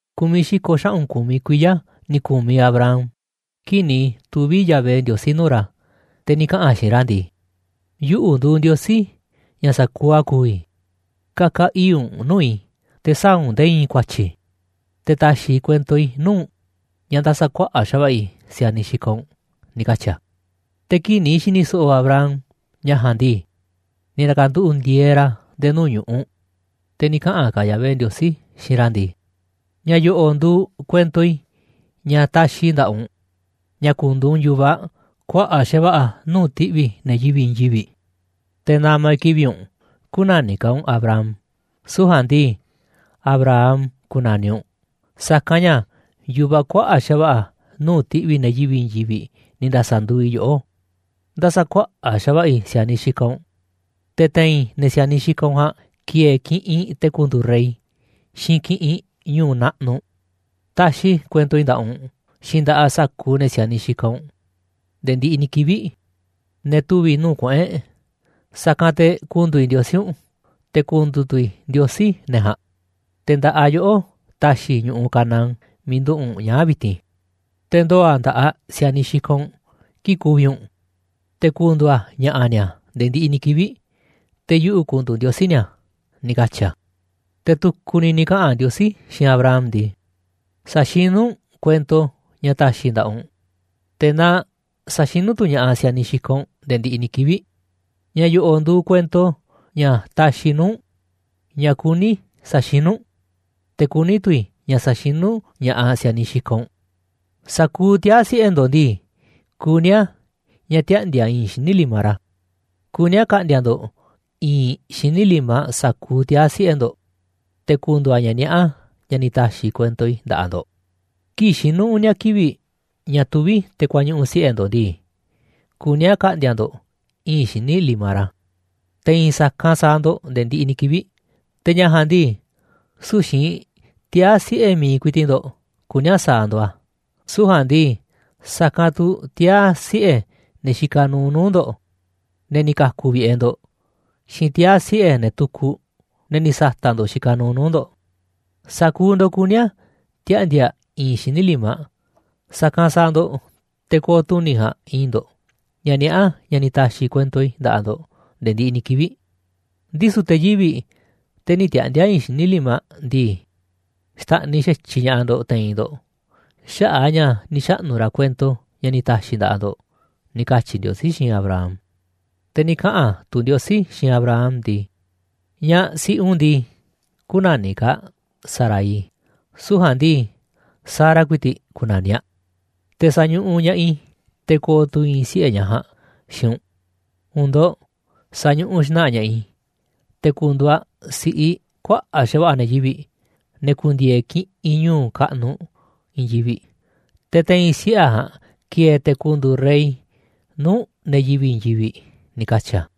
Ku̱miꞌ xi̱ko̱ xaꞌu̱n ku̱miꞌ kuiya̱ ni̱ ku̱miꞌ Abram kii̱ꞌ ni̱ tuvi̱ Yahvé Ndiosí nuu̱ꞌ ra̱, te̱ ni̱ kaꞌa̱n a̱ xiinꞌ ra̱ ndii: ―Yuꞌu̱ nduuꞌ Ndiosí, ña̱ sa̱kuuꞌ a̱ ku̱vi̱, ka̱ka̱ ii̱ꞌ u̱nꞌ nuu̱ꞌ i̱, te̱ sä̱a̱ u̱nꞌ nde̱e̱ i̱i̱n ku̱a̱tyi̱. Te̱ ta̱xi̱ i̱ kuento i̱ nuu̱ꞌ u̱nꞌ ña̱ nda̱sa̱kuaꞌa̱ꞌ xa̱va̱ꞌa̱ i̱ si̱a̱niꞌ xikaꞌ u̱nꞌ ―ni̱ katyi̱ a̱. Te̱ kii̱ꞌ ni̱ xi̱ni̱ so̱ꞌo̱ Abram ña̱ ja̱a̱nꞌ ndii, ni̱ na̱ka̱nduꞌu̱ꞌ ndi̱e̱e̱ ra̱ nde̱e̱ nuu̱ꞌ ñu̱ꞌuꞌ, te̱ ni̱ kaꞌa̱n ka̱ Yahvé Ndiosí xiinꞌ ra̱ ndii: ―Ña̱ yo̱ꞌo̱ nduuꞌ kuento i̱ ña̱ taxiꞌ i̱ nda̱ꞌaꞌ u̱nꞌ, ña̱ ku̱ndu̱u̱ u̱nꞌ yu̱vaꞌ kuaꞌa̱ꞌ xa̱va̱ꞌa̱ nuu̱ꞌ ti̱ꞌvi̱ ne̱ yivi̱ꞌ i̱i̱n yivi̱ꞌ. Te̱ na̱ma̱ i̱ kivi̱ꞌ u̱nꞌ, kü̱na̱niꞌ ka̱ u̱nꞌ Abram, süu̱ꞌ ja̱a̱nꞌ ndii, Abraham ku̱na̱niꞌ u̱nꞌ, sa̱kanꞌ ña̱ yu̱vaꞌ kuaꞌa̱ꞌ xa̱va̱ꞌa̱ nuu̱ꞌ ti̱ꞌvi̱ ne̱ yivi̱ꞌ i̱i̱n yivi̱ꞌ ni̱ nda̱sa̱nduuꞌ i̱ yoꞌó. Nda̱sa̱kuaꞌa̱ꞌ xa̱va̱ꞌa̱ i̱ si̱a̱niꞌ xikaꞌ u̱nꞌ, te̱ te̱i̱n ne̱ si̱a̱niꞌ xikaꞌ u̱nꞌ ja̱a̱nꞌ ki̱e̱e̱ kiꞌinꞌ te̱ ku̱ndu̱u̱ rey, xiinꞌ kiꞌinꞌ ñu̱u̱ naꞌnuꞌ. Taxiꞌ i̱ kuento i̱ nda̱ꞌaꞌ u̱nꞌ, xiinꞌ nda̱ꞌaꞌ sa̱kuuꞌ ne̱ si̱a̱niꞌ xikaꞌ u̱nꞌ nde̱e̱ ndiꞌiꞌ ni̱ kivi̱ꞌ, ne̱ tuvi̱ nuu̱ꞌ kuꞌu̱n e̱ꞌ, sa̱kanꞌ te̱ ku̱ndu̱u̱ i̱ Ndiosí u̱nꞌ, te̱ ku̱ndu̱u̱ tu̱ i̱ Ndiosí ne̱ ja̱a̱nꞌ. Te̱ nda̱ꞌaꞌ yoꞌó ta̱xi̱ i̱ ñu̱ꞌuꞌ Canaán miiꞌ nduꞌu̱ꞌ u̱nꞌ ñaa̱ꞌ vi̱ti̱n, te̱ ndoo̱ a̱ nda̱ꞌaꞌ si̱a̱niꞌ xikaꞌ u̱nꞌ kii̱ꞌ ku̱vi̱ u̱nꞌ, te̱ ku̱ndu̱u̱ a̱ ña̱ꞌa̱ ni̱a̱ nde̱e̱ ndiꞌiꞌ ni̱ kivi̱ꞌ, te̱ yuꞌu̱ ku̱ndu̱u̱ Ndiosí ni̱a̱ ―ni̱ katyi̱ a̱. Te̱ tu̱ku̱ ni̱ ni̱ kaꞌa̱n Ndiosí xiinꞌ Abraham ndii: ―Sa̱xinú u̱nꞌ kuento ña̱ ta̱xi̱ i̱ nda̱ꞌaꞌ u̱nꞌ, te̱ na sa̱xinú tu̱ ña̱ꞌaꞌ si̱a̱niꞌ xikaꞌ u̱nꞌ nde̱e̱ ndiꞌiꞌ ni̱ kivi̱ꞌ. Ña̱ yo̱ꞌo̱ nduuꞌ kuento ña̱ taxiꞌ i̱ nuu̱ꞌ u̱nꞌ, ña̱ kuní i̱ sa̱xinú u̱nꞌ, te̱ kuní tu̱ i̱ ña̱ sa̱xinú ña̱ꞌaꞌ si̱a̱niꞌ xikaꞌ u̱nꞌ: Sa̱kuuꞌ tiaa̱ siꞌe̱ ndo̱ꞌ ndii, kuní a̱ ña̱ tiaꞌndi̱a̱ i̱i̱nꞌ xíniꞌ limaꞌ ra̱. Kuní a̱ ka̱ꞌndi̱a̱ ndo̱ꞌ i̱i̱nꞌ xíniꞌ limaꞌ sa̱kuuꞌ tiaa̱ siꞌe̱ ndo̱ꞌ, te̱ ku̱ndu̱u̱ a̱ ña̱ niaꞌá ña̱ ni̱ ta̱xi̱ i̱ kuento i̱ nda̱ꞌaꞌ ndo̱ꞌ. Kii̱ꞌ xinu̱ uni̱a̱ kivi̱ꞌ ña̱ tuví te̱ kuañuꞌu̱ siꞌe̱ ndo̱ꞌ ndii, kuní a̱ ka̱ꞌndi̱a̱ ndo̱ꞌ i̱i̱n xíniꞌ limaꞌ ra̱, te̱ i̱i̱n sa̱kanꞌ sa̱a̱ ndo̱ꞌ nde̱e̱ ndiꞌiꞌ ni̱ kivi̱ꞌ. Te̱ ña̱ ja̱a̱nꞌ ndii, süu̱ꞌ xiinꞌ tiaa̱ siꞌe̱ mi̱iꞌ ku̱i̱ti̱ꞌ ndo̱ꞌ kuní a̱ sa̱a̱ ndo̱ꞌ a̱, süu̱ꞌ ja̱a̱nꞌ ndii, sa̱kanꞌ tu̱ tiaa̱ siꞌe̱ ne̱ xikaꞌ nuuꞌ nuu̱ꞌ ndo̱ꞌ, ne̱ ni̱ ka̱ku̱ vi̱ꞌe̱ ndo̱ꞌ, xiinꞌ tiaa̱ siꞌe̱ ne̱ tukuꞌ, ne̱ ni̱ sa̱ta̱ꞌ ndo̱ꞌ xikaꞌ nuuꞌ nuu̱ꞌ ndo̱ꞌ. Sa̱kuuꞌ ndo̱ꞌ kuní a̱ tiaꞌndi̱a̱ i̱i̱nꞌ xíniꞌ limaꞌ, sa̱kanꞌ sa̱a̱ ndo̱ꞌ te̱ ko̱o̱ tuni̱ ja̱a̱nꞌ i̱i̱nꞌ ndo̱ꞌ, ña̱ niaꞌá ña̱ ni̱ ta̱xi̱ i̱ kuento i̱ nda̱ꞌaꞌ ndo̱ꞌ nde̱e̱ ndiꞌiꞌ ni̱ kivi̱ꞌ. Ndisu̱ te̱ yivi̱ꞌ, te̱ nï̱ tiaꞌndi̱a̱ i̱i̱nꞌ xíniꞌ limaꞌ ndii, xta̱ꞌniꞌ xa̱tyiꞌ ña̱ꞌaꞌ ndo̱ꞌ te̱i̱n ndo̱ꞌ xaꞌa̱ꞌ a̱ ña̱ ni̱ xaꞌnu̱ ra̱ kuento ña̱ ni̱ ta̱xi̱ i̱ nda̱ꞌaꞌ ndo̱ꞌ ―ni̱ katyi̱ Ndiosí, xiinꞌ Abraham. Te̱ ni̱ kaꞌa̱n tu̱ Ndiosí xiinꞌ Abraham ndii: ―Ñaꞌ siꞌi u̱nꞌ ndii, kü̱na̱niꞌ ka̱ aꞌ Sarai, süu̱ꞌ ja̱a̱nꞌ ndii, Sara ku̱i̱ti̱ꞌ ku̱na̱niꞌ aꞌ. Te̱ sa̱ñuꞌuꞌ ña̱ꞌaꞌ i̱, te̱ ko̱o̱ tu̱ i̱i̱n siꞌe̱ ñaꞌ ja̱a̱nꞌ xiinꞌ u̱nꞌ. U̱u̱n ndo̱ꞌ sa̱ñuꞌuꞌ xna̱ꞌa̱ ña̱ꞌaꞌ i̱, te̱ ku̱ndu̱u̱ aꞌ si̱ꞌiꞌ kuaꞌa̱ꞌ xa̱va̱ꞌa̱ ne̱ yivi̱ꞌ, ne̱ ku̱ndi̱e̱e̱ kiꞌinꞌ ñu̱u̱ kaꞌnuꞌ i̱i̱n yivi̱ꞌ, te̱ te̱i̱n siꞌe̱ aꞌ ja̱a̱nꞌ ki̱e̱e̱ te̱ ku̱ndu̱u̱ rey nuu̱ꞌ ne̱ yivi̱ꞌ i̱i̱n yivi̱ꞌ ―ni̱ katyi̱ a̱.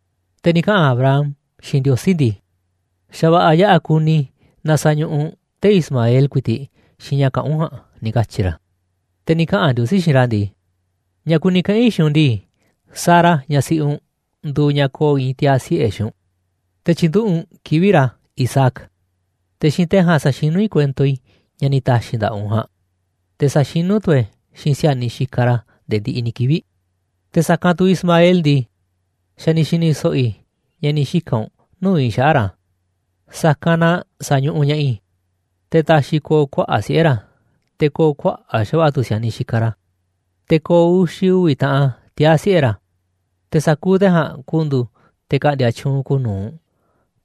Te̱ ni̱ kaꞌa̱n Abraham xiinꞌ Ndiosí ndii: ―Xa̱ va̱ꞌa̱ yaꞌa̱ kuni i̱ naaꞌ sa̱ñuꞌuꞌ u̱nꞌ tee̱ꞌ Ismael ku̱i̱ti̱ꞌ xiinꞌ ña̱ kaꞌán u̱nꞌ ja̱a̱nꞌ ―ni̱ katyi̱ ra̱. Te̱ ni̱ kaꞌa̱n Ndiosí xiinꞌ ra̱ ndii: ―Ña̱ kuni kaꞌa̱n i̱ xiinꞌ u̱nꞌ ndii, Sara, ñaꞌ siꞌi u̱nꞌ, nduuꞌ ñaꞌ ko̱o̱ i̱i̱n tiaa̱ siꞌe̱ xiinꞌ u̱nꞌ, te̱ tyi̱nduꞌu̱ꞌ u̱nꞌ kivi̱ꞌ ra̱ Isaac. Te̱ xiinꞌ te̱ ja̱a̱nꞌ sa̱xinú i̱ kuento i̱ ña̱ ni̱ ta̱xi̱ i̱ nda̱ꞌaꞌ u̱nꞌ ja̱a̱nꞌ, te̱ sa̱xinú tu̱ e̱ꞌ e̱ xiinꞌ si̱a̱niꞌ xikaꞌ ra̱ nde̱e̱ ndiꞌiꞌ ni̱ kivi̱ꞌ. Te̱ sa̱kanꞌ tu̱ Ismael ndii, xa̱ ni̱ xi̱ni̱ so̱ꞌo̱ i̱ ña̱ ni̱ xika̱n u̱nꞌ nuu̱ꞌ i̱ xaꞌa̱ꞌ ra̱, sa̱kanꞌ na sa̱ñuꞌuꞌ ña̱ꞌaꞌ i̱, te̱ ta̱xi̱ i̱ ko̱o̱ kuaꞌa̱ꞌ siꞌe̱ ra̱, te̱ ko̱o̱ kuaꞌa̱ꞌ xa̱va̱ꞌa̱ tu̱ si̱a̱niꞌ xikaꞌ ra̱. Te̱ ko̱o̱ uxi̱ uvi̱ taꞌan tiaa̱ siꞌe̱ ra̱, te̱ sa̱kuuꞌ te̱ ja̱a̱nꞌ ku̱ndu̱u̱ te̱ ka̱ꞌndi̱a̱ tyuunꞌ kuuꞌ nu̱uꞌ,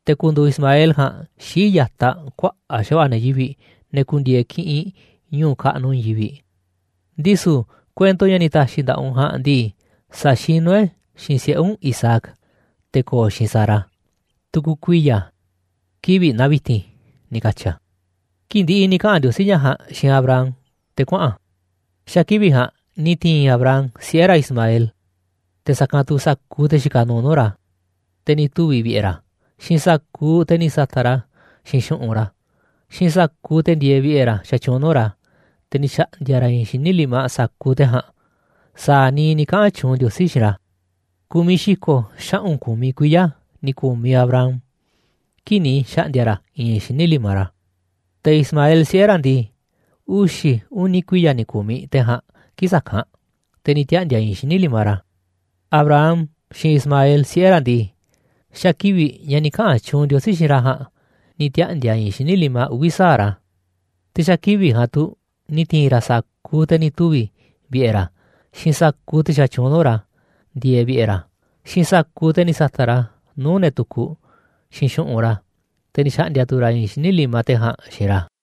te̱ ku̱ndu̱u̱ Ismael ja̱a̱nꞌ xii̱ꞌ ya̱taꞌ kuaꞌa̱ꞌ xa̱va̱ꞌa̱ ne̱ yivi̱ꞌ, ne̱ ku̱ndi̱e̱e̱ kiꞌinꞌ ñu̱u̱ kaꞌnuꞌ i̱i̱n yivi̱ꞌ. Ndisu̱ kuento ña̱ ni̱ ta̱xi̱ i̱ nda̱ꞌaꞌ u̱nꞌ ja̱a̱nꞌ ndii, sa̱xinú e̱ꞌ e̱ xiinꞌ siꞌe̱ u̱nꞌ Isaac, te̱ ko̱o̱ xiinꞌ Sara, tu̱ku̱ kuiya̱, kivi̱ꞌ naa vi̱ti̱n ―ni̱ katyi̱ a̱. Kii̱ꞌ ndi̱ꞌi̱ ni̱ kaꞌa̱n Ndiosí ña̱ ja̱a̱nꞌ xiinꞌ Abraham te̱ kuaꞌa̱n a̱. Xa̱ kivi̱ꞌ ja̱a̱nꞌ ni̱ ti̱i̱n Abraham siꞌe̱ ra̱ Ismael, te̱ sa̱kanꞌ tu̱ sa̱kuuꞌ te̱ xikaꞌ nuuꞌ nuu̱ꞌ ra̱, te̱ ni̱ tuvi̱ vi̱ꞌe̱ ra̱, xiinꞌ sa̱kuuꞌ te̱ ni̱ sa̱ta̱ꞌ ra̱ xiinꞌ xu̱ꞌunꞌ ra̱, xiinꞌ sa̱kuuꞌ te̱ ndieeꞌ vi̱ꞌe̱ ra̱ xatyuunꞌ nuu̱ꞌ ra̱, te̱ ni̱ xa̱ꞌndi̱a̱ ra̱ i̱i̱n xíniꞌ limaꞌ sa̱kuuꞌ te̱ ja̱a̱nꞌ, sa̱a̱ niiꞌ ni̱ kaꞌa̱n tyuunꞌ Ndiosí xiinꞌ ra̱. Ku̱miꞌ xi̱ko̱ xaꞌu̱n ku̱miꞌ kuiya̱ ni̱ ku̱miꞌ Abraham kii̱ꞌ ni̱ xa̱ꞌndi̱a̱ ra̱ i̱i̱nꞌ xíniꞌ limaꞌ ra̱. Te̱ Ismael siꞌe̱ ra̱ ndii, uxi̱ uni̱ kuiya̱ ni̱ ku̱miꞌ te̱ ja̱a̱nꞌ kii̱ꞌ sa̱kanꞌ, te̱ ni̱ tiaꞌndi̱a̱ i̱i̱nꞌ xíniꞌ limaꞌ ra̱. Abraham xiinꞌ Ismael siꞌe̱ ra̱ ndii, xa̱ kivi̱ꞌ ña̱ ni̱ kaꞌa̱n tyuunꞌ Ndiosí xiinꞌ ra̱ ja̱a̱nꞌ ni̱ tiaꞌndi̱a̱ i̱i̱nꞌ xíniꞌ limaꞌ uvi̱ sa̱aꞌ ra̱. Te̱ xa̱ kivi̱ꞌ ja̱a̱nꞌ tu̱ ni̱ ti̱i̱n ra̱ sa̱kuuꞌ te̱ ni̱ tuvi̱ vi̱ꞌe̱ ra̱, xiinꞌ sa̱kuuꞌ te̱ xatyuunꞌ nuu̱ꞌ ra̱ ndieeꞌ vi̱ꞌe̱ ra̱, xiinꞌ sa̱kuuꞌ te̱ ni̱ sa̱ta̱ꞌ ra̱ nuu̱ꞌ te̱ tu̱ku̱ xiinꞌ xu̱ꞌunꞌ ra̱, te̱ ni̱ xa̱ꞌndi̱a̱ tu̱ ra̱ i̱i̱nꞌ xíniꞌ limaꞌ te̱ ja̱a̱nꞌ xiinꞌ ra̱.